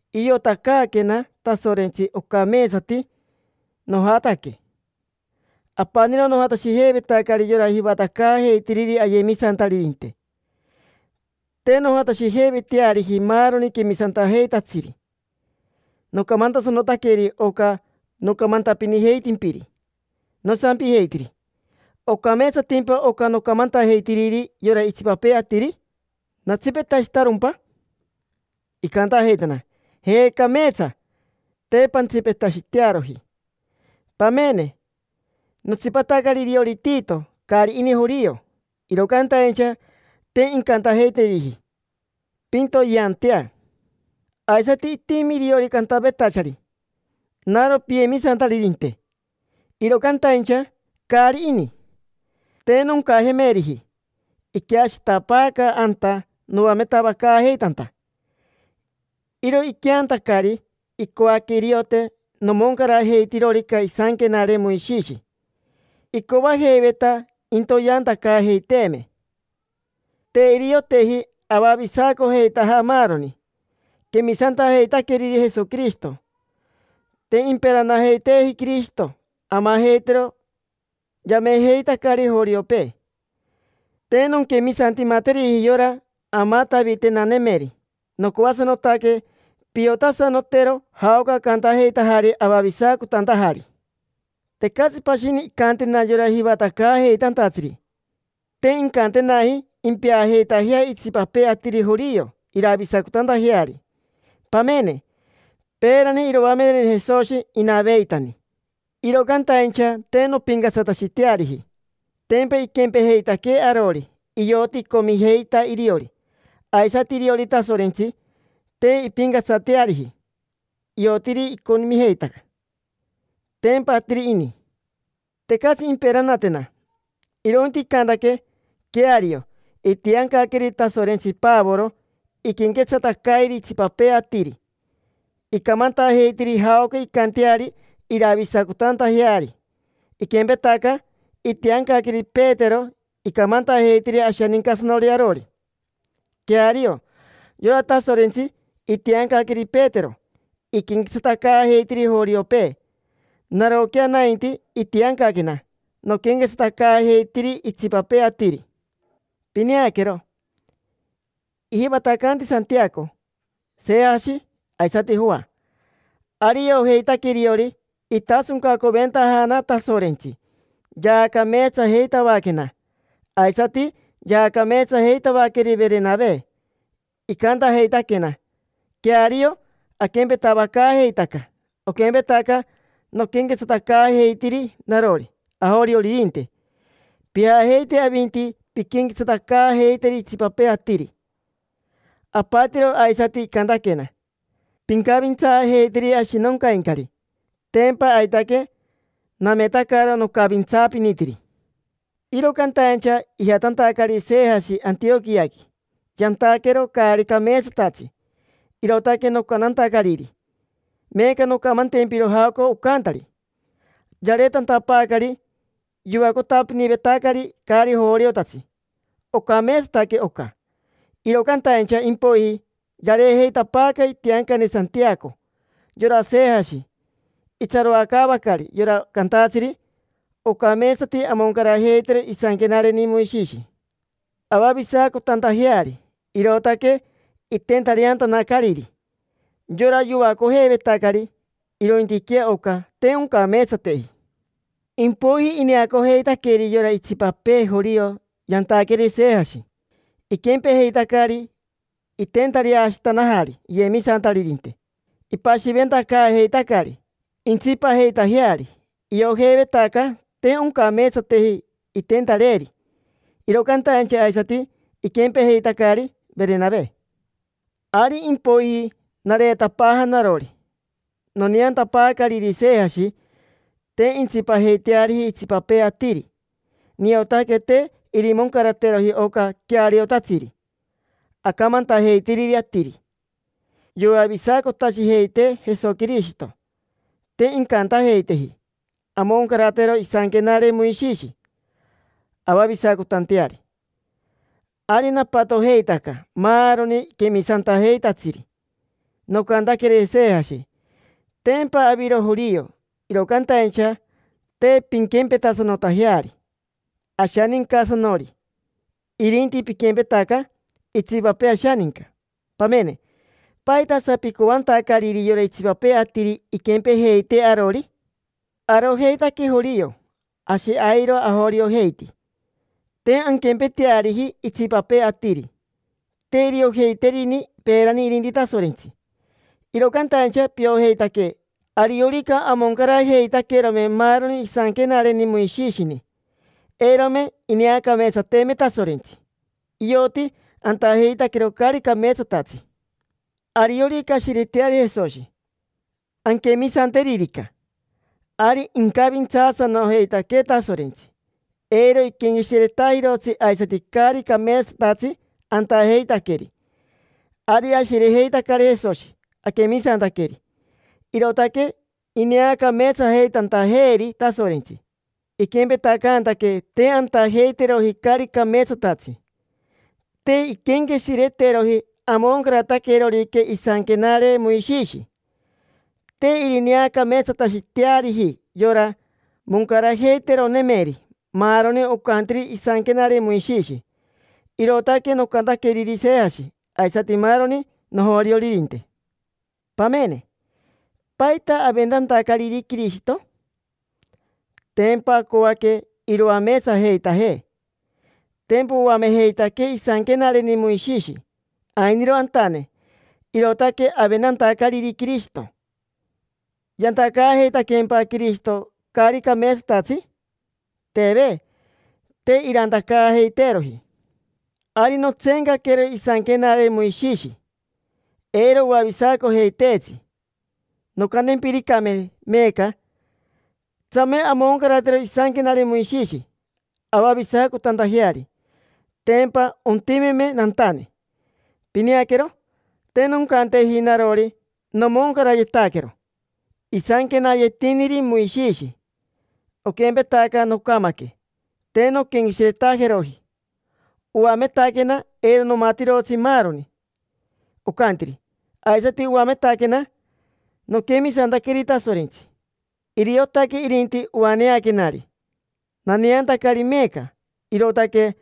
Iotacaaquena Tasorentsi ocameetsati nojataque. Apaniro nojatashijeivetacari yora jivatacaajeitiriri ayemisantaririnte, te nojatashijeiveteariji maaroni quemisantajeitatsiri. Nocamantasanotaqueri oca nocamantapinijeitimpiri. Nosampijeitiri: “¿Ocameetsatimpa oca nocamantajeitiriri yora itsipapee atiri? ¿Natsipetashitarompa?” Icantajeitana: “Je, cameetsa; te pantsipetashitearoji”. Pamene, notsipatacari iriori Tito. Caari ini jorio, iro cantaincha te incantajeiteriji: “Pintoyeantea”. Aisati itimi iriori cantavetachari: “Naro piyemisantaririnte”, iro cantaincha caari ini. Te noncajemeriji: iqueashitapaaca anta noametavacaajeitanta. Iro iqueantacari, icoaque iriote nomoncarajeitirorica isanquenare Moishishi, icoajeiveta intoyeantacaajeiteeme. Te irioteji avavisacojeitaja maaroni quemisantajeitaqueriri Jesoquirishito, te imperanajeiteeji Quirishito amajeitero yamejeitacari joriopee. Te nonquemisantimateriji yora amatavitenanemeri. Nocoasanotaque piotasanotero jaoca acantajeitajari avavisacotantajari. Tecatsi pashini incantena yora jivatacaajeitantatsiri. Te incantenaji: “Impeajeitajea itsipapee atiri jorio iravisacotantajeari”. Pamene, peerani iroamereni Jesoshi inaveitani, iro cantaincha te nompincatsatashiteariji. Tempa iquempejeitaquee arori: ioti icomijeita iriori. Aisati iriori Tasorentsi, te impincatsateariji: iotiri icomijeita, tempa atiri ini. Tecatsi imperanatena, irointi icantaque: “Queario, itiancaqueri Tasorentsi Pavoro iquenquetsatacairi itsipapee atiri, icamantajeitiri jaoca incanteari iravisacotantajeari. Iquempetaca itiancaqueri Petero icamantajeitiri ashanincasanori arori”. Queario, yora Tasorentsi itiancaqueri Petero iquenquetsatacaajeitiri joriopee. Naroquea nainti, itiancaquena noquenquetsatacaajeitiri itsipapee atiri. Pineaquero, ijivatacanti Santiaco, Sejashi, aisati Joa. Ari iojeitaque iriori itasoncacoventajana Tasorentsi. Yaacameetsajeitavaquena, aisati yaacameetsajeitavaqueri Verenave; icantajeitaquena: “Queario, aquempetavacaajeitaca. Oquempetaca noquenquetsatacaajeitiri narori ajorioririnte, pijajeite avinti pinquenquetsatacaajeiteri itsipapee atiri”. Apatiro aisati icantaquena: “Pincavintsaajeiteri ashinoncaincari”. Tempa aitaque nametacaro nocavintsaapinitiri. Iro cantaincha ijatantacari Sejashi Antioquiaqui, yantaquero caari cameetsatatsi, irootaque nocantantacariri. Meeca noncamantempiro jaoca ocantari. Yareetantapaacari yoacotapinivetacari caari joriotatsi. Ocameetsataque oca, iro cantaincha impoiji yareejeitapaaca itiancane Santiaco. Yora Sejashi itsaroacaavacari yora cantatsiri ocameetsati amoncarajeitero isanquenareni Moishishi avavisacotantajeari, irootaque itentareantanacariri yora yoacojeivetacari. Irointiquea oca, te oncameetsateji. Impoiji ineacojeitaqueri yora itsipapee jorio yantaqueri Sejashi, iquempejeitacari: itentareashitanajari iyemisantaririnte, ipashiventacaajeitacari intsipajeitajeari. Iojeivetaca te oncameetsateji intentareeri, iro cantaincha aisati iquempejeitacari Verenave. Ari impoiji nareetapaaja narori. Noneantapaacariri Sejashi te intsipajeiteariji itsipapee atiri, niotaque te irimoncarateroji oca queariotatsiri acamantajeitiriri atiri: “Yoavisacotashijeitee Jesoquirishito, te incantajeiteeji amoncaratero isanquenare Moishishi avavisacotanteari”. Ari napatojeitaca maaroni quemisantajeitatsiri. Nocantaqueri Sejashi: “Tempa aviro jorio, iro cantaincha te pinquempetasanotajeari ashanincasanori, irinti piquempetaca itsipapee ashaninca. Pamene, ¿paitasa picoacaantacariri yora itsipapee atiri inquempejeitee arori? Arojeitaque jorio, ashi airo ajoriojeiti. Te anquempeteariji itsipapee atiri: te iriojeiterini peerani irinti Tasorentsi. Iro cantaincha piojeitaque ariorica amoncarajeitaquerome maaroni isanquenareni Moishishini, eirome ineacameetsateeme Tasorentsi, ioti antajeitaquero caari cameetsatatsi. Ariorica ashireteari Jesoshi, anquemisanteririca, ari incavintsaasanojeitaquee Tasorentsi, eiro iquenqueshiretajirotsi aisati caari cameetsatatsi antajeitaqueri. Ari ashirejeitacari Jesoshi, aquemisantaqueri, irootaque ineacameetsajeitantajeeri Tasorentsi, iquempetacantaquee te antajeiteroji caari cameetsatatsi. Te inquenqueshireteroji amoncarataquerorica isanquenare Moishishi. Te irineacameetsatashiteariji yora moncarajeiteronemeri maaroni ocantiri isanquenare Moishishi”. Irootaque nocantaqueriri Sejashi aisati maaroni nojorioririnte. Pamene, ¿paita aventantacariri Quirishito? Tempa acoaque iroameetsajeitajee. Tempa oamejeitaquee isanquenareni Moishishi ainiro antane, irootaque aventantacariri Quirishito. ¿Yantacaajeitaqueempa Quirishito caari cameetsatatsi? Teve, te irantacaajeiteeroji. Ari notseencaquero isanquenare Moishishi, eiro oavisacojeiteetsi. Noncantempiricame meeca: “Tsame amoncaratero isanquenare Moishishi avavisacotantajeari”, tempa ontimeme nantane. Pineaquero, te noncanteji narori: “Nomoncarayetaquero isanquenayetiniri Moishishi”. Oquempetaca nocamaque, te nonquenqueshiretajeroji. Oametaquena eiro nomatirotsi maaroni ocantiri, aisati oametaquena noquemisantaqueri Tasorentsi. Iriotaque irinti oaneaquenari, naneantacari meeca; irootaque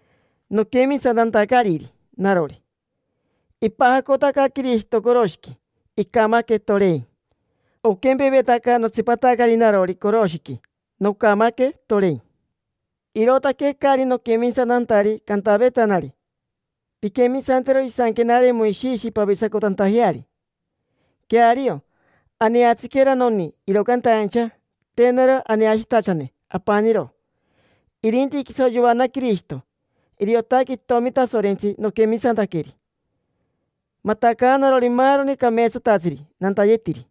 noquemisantantacariri narori. Ipajacotaca Quirishito coroshiqui, icamaque, torein. Oquempevetaca notsipatacari narori coroshiqui, nocamaque, torein, irootaque caari noquemisantantari cantavetanari: “Pinquemisantero isanquenare Moishishi pavisacotantajeari”. Queario, aneatsiquera noni, iro cantaincha te naro aneashitachane apaniro, irinti quiso yoana Quirishito. Iriotaque itomi Tasorentsi noquemisantaqueri, matacaanarori maaroni cameetsatatsiri nantayetiri.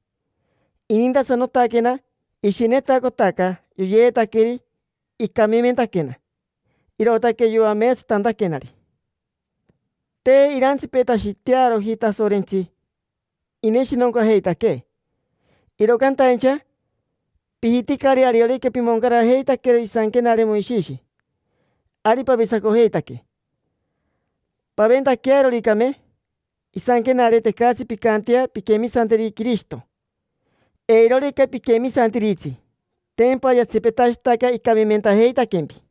Inintasanotaquena, ishinetacotaca yoyeetaqueri, icamimentaquena irootaque yoameetsatantaquenari. Te irantsipetashitearoji Tasorentsi ineshinoncajeitaquee. Iro cantaincha, pijiticari ariorica pimoncarajeitaquero isanquenare Moishishi ari pavisacojeitaque. Paventaquearoricame isanquenare, tecatsi pincantea pinquemisanteri Quirishito. Eirorica piquemisantiritsi, tempa yatsipetashitaca icamimentajeitaquempi.